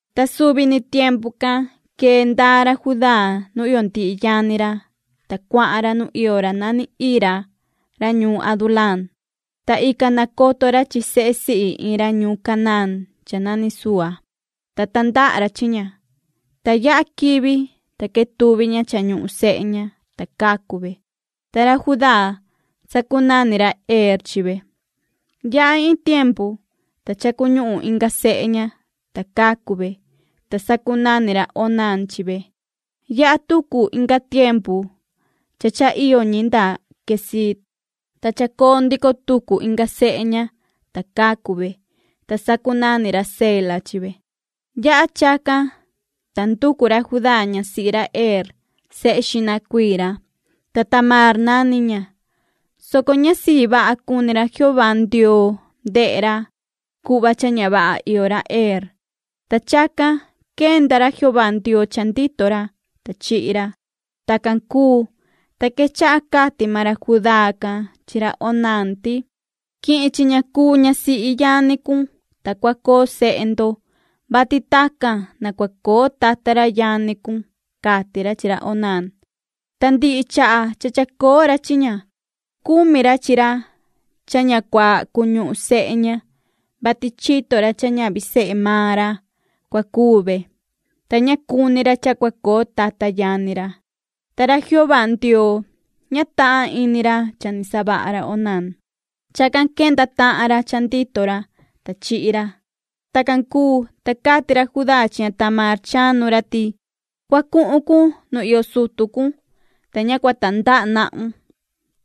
Ta suvi ni tiempu can quee ndaa ra Judá nu iyo ndihi yani ra, ta cuahan ra nu iyo ra nani Hira ra ñuun Adulaam. Ta ican nacoto ra chi sehe sihi iin ra ñuun Canaán cha nani Sua. Ta tandaha ra chi ña. Ta yaha quivi, ta quetuvi ña cha ñuhun sehe ña, ta cacu ve, ta ra Judá, sacunani ra Er chi ve. Yaha iin tiempu, ta cha cuñuhun inga sehe ña, ta cacu ve, ta sacunani ra Onán chi ve. Yaha tucu inga tiempu cha cha iyo ñi nda Queziib, ta chacoo ndico tucu inga sehe ña, ta cacu ve, ta sacunani ra Sela chi ve. Yaha chacan, ta nducu ra Judá ñasihi ra Er sehe xihna cuii ra, ta Tamaar nani ña, soco ña sii vaha cuni ra Jehová Ndioo ndehe ra cuhva cha ña vaha iyo ra Er, ta chacan quenda ra Jehová Ndioo cha ndito ra, ta chihi ra. Tacan cuu, ta quechaha cati maan ra Judá can chi ra Onán ti: ―Quihin chi ña cuu ñasihi yani cun, ta cua coo sehe ndo, vati tacan na cua coo tata ra yani cun ―cati ra chi ra Onán. Ta ndihi chaha cha chacoo ra chi ña cumi ra chi ra cha na ña cua cuñuhun sehe ña, vati chito ra cha ñavi sehe maan ra cua cuu ve, ta ña cuni ra cha cua coo tata yani ra. Ta ra Jehová Ndioo, ña tahan ini ra cha ni savaha ra Onán. Chacan quenda tahan ra cha ndito ra, ta chihi ra. Tacan cuu, ta cati ra Judá chi ña Tamaar chanu ra ti: ―Cua cuhun cun nu iyo sutu cun, ta ña cua tandaha nahun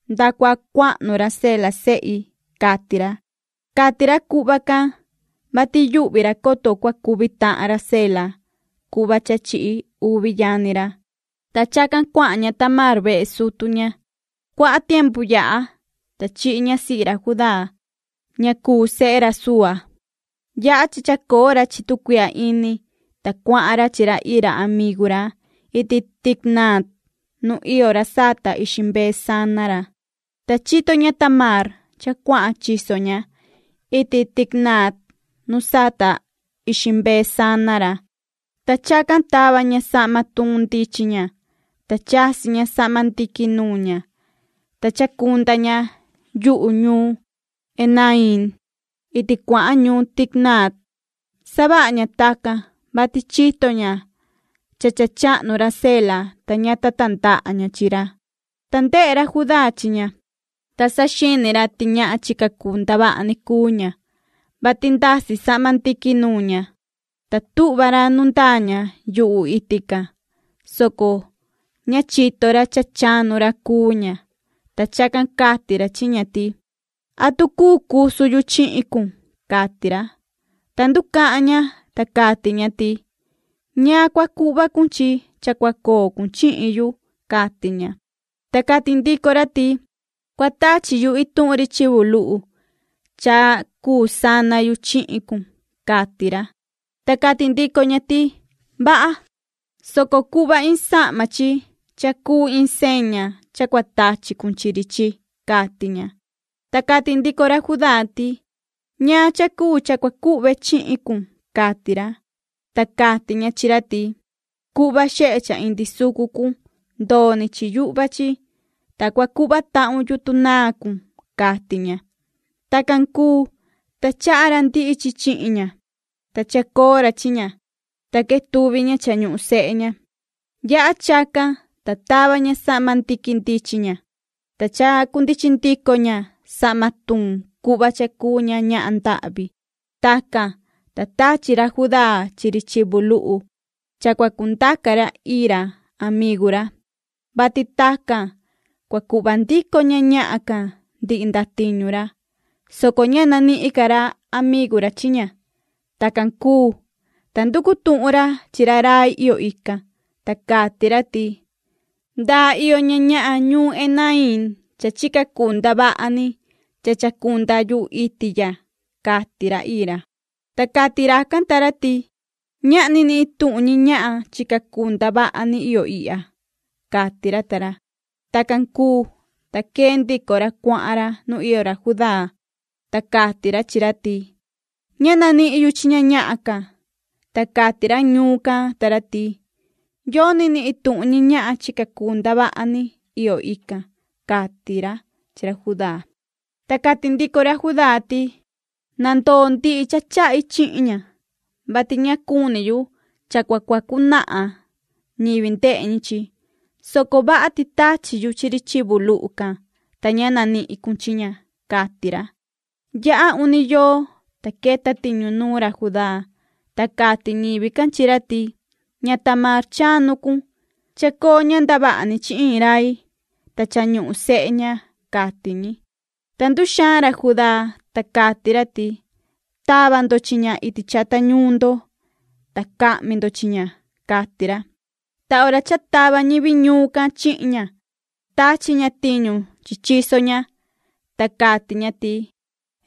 nda cua cuahnu ra Sela sehi ―cati ra. Cati ra cuhva can, vati yuhvi ra, coto cua cuvi tahan ra Sela cuhva cha chihi uvi yani ra. Ta chacan cuahan ña Tamaar vehe sutu ña. Cuaha tiempu yaha, ta chihi ñasihi ra Judá, ña cuu sehe ra Sua. Yaha cha chacoo ra chi tu cuihya ini, ta cuahan ra chi ra Hira amigu ra iti Timnatt nu iyo ra sata ixi mbee chi ixi chivu sana ra. Ta chito ña Tamaar cha cuahan chiso ña iti Timnatt nu sata ixi mbee chi ixi chivu sana ra. Ta chacan tava ña sahma tuun ndichin ña, ta chasi ña sahma ndiqui nuun ña, ta chacunda ña yuhu ñuun Enaiim iti cuahan ñuun Timnatt. Savaha ña tacan, vati chito ña cha cha chahnu ra Sela, ta ña ta tandaha ña chi ra. Ta ndehe ra Judá chi ña, ta saxini ra ti ñahan chica cuu ndavaha ni cuu ña, vati ndasi sahma ndiqui nuun ña. Ta tuhva ra nu ndaa ña yuhu iti can, soco ña chito ra cha chanu ra cuu ña, ta chacan cati ra chi ña ti: ―¿Atu cuu cusu yu chihin cun? ―cati ra. Ta nducahan ña, ta cati ña ti: ―¿Ñaan cua cuhva cun chi cha cua coo cun chihin yu? ―cati ña. Ta cati ndico ra ti: ―Cua tachi yu in chivu luhu cha cuu sana yu chihin cun ―cati ra. Ta cati ndico ña ti: ―Vaha, soco cuhva in sahma chi cha cuu in seña cha cua tachi cun chi ri chi ―cati ña. Ta cati ndico ra Judá ti: ―¿Ñaan cha cuu cha cua cuhve chihin cun? ―cati ra. Ta cati ña chi ra ti: ―Cuhva xehe cha indi sucu cun ndoo ni chi yuhva chi, ta cua cuhva tahun yutun naa cun ―cati ña. Tacan cuu, ta chaha ra ndihi chi chihin ña, ta chacoo ra chi ña, ta quetuvi ña cha ñuhun sehe ña. Yaha chacan, ta tava ña sahma ndiqui ndichin ña, ta chacundichin ndico ña sahma tuun cuhva cha cuu ña ñahan ndahvi. Tacan, ta tachi ra Judá chi ri chivu luhu cha cua cundaca ra Hira amigu ra, vati tacan cua cuhva ndico ña ñahan can ndihi ndatiñu ra, soco ña nanihin ca amigu ra chi ña. Tacan cuu, ta nducu tuhun ra chi ra rai iyo ican, ta cati ra ti: ―¿Ndaa iyo ña ñahan ñuun Enaiim cha chica cuu ndavaha ni cha chacunda yuhu iti ya? ―cati ra Hira. Ta cati racan ta ra ti: ―Ñahni ni ituhun ñi ñahan chica cuu ndavaha ni iyo ihya ―cati ra ta ra. Tacan cuu, ta quee ndico ra cuahan ra nu iyo ra Judá, ta cati ra chi ra ti: ―Ña nanihin yu chi ña ñahan can, ta cati ra ñuun can ta ra ti yoni ni ituhun ñi ñahan chica cuu ndavaha ni iyo ican ―cati ra chi ra Judá. Ta cati ndico ra Judá ti: ―Na ndoo ndihi cha chahi chihin ña, vati ña cuni yu cha cua cuacu nahan ñivi ndehe ñi chi, soco vaha ti tachi yu chi ri chivu luhu can, ta ña nanihin cun chi ña ―cati ra. Yaha uni yoo, ta queta tiñu nuun ra Judá, ta cati ñivi can chi ra ti: ―Ña Tamaar chanu cun, chacoo ña ndavaha ni chi iin rai, ta cha ñuhun sehe ña ―cati ñi. Ta nduxaan ra Judá, ta cati ra ti: ―¡Tava ndo chi ña iti chata ñuun ndo, ta cahmi ndo chi ña! ―cati ra. Ta hora cha tava ñivi ñuun can chihin ña tachi ña tiñu chi chiso ña, ta cati ña ti:”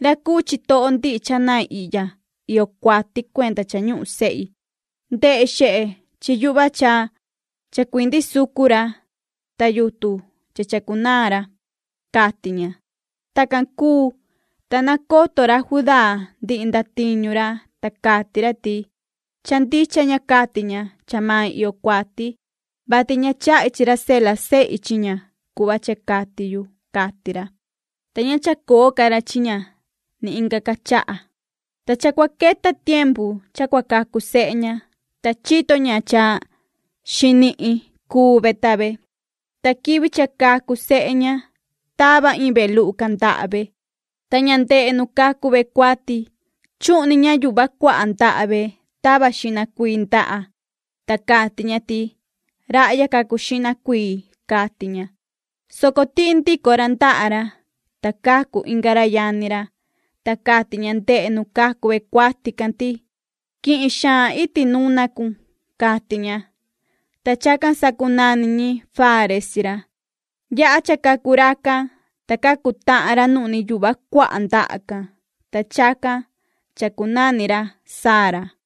Ra cuu chitoho ndihi cha nain ihya iyo cuati cuenda cha ñuhun sehi. Ta ndehe xehe chi yuhva cha chacuindi sucu ra, ta yutun cha chacunaan ra”, cati ña. Tacan cuu, ta nacoto ra Judá ndihi ndatiñu ra, ta cati ra ti: “Cha ndicha ña cati ña cha mai iyo cuati, vati ña chahi chi ra Sela sehi chi ña cuhva cha cati yu”, cati ra. Ta ña chacoo ca ra chi ña ni inga ca chaha. Ta cha cua queta tiempu cha cua cacu sehe ña, ta chito ña cha xinihin cuu ve ta ve. Ta quivi cha cacu sehe ña tava iin ve luhu can, ndaha ve, ta ña ndehe nu cacu ve cuati, chuhni ña yuhva cuaha ndaha ve tava xihna cuii ndaha, ta cati ña ti:” Rahya cacu xihna cuii”, cati ña, soco tihi ndico ra ndaha ra, ta cacu inga ra yani ra, ta cati ña ndehe nu cacu ve cuati can ti:” Quihin xaan iti nuna cun”, cati ña. Ta chacan sacunani ñi Fares chi ra. Yaha cha cacu racan, ta cacu tahan ra nuhni yuhva cuaha ndaha can, ta chacan chacunani ra Zara.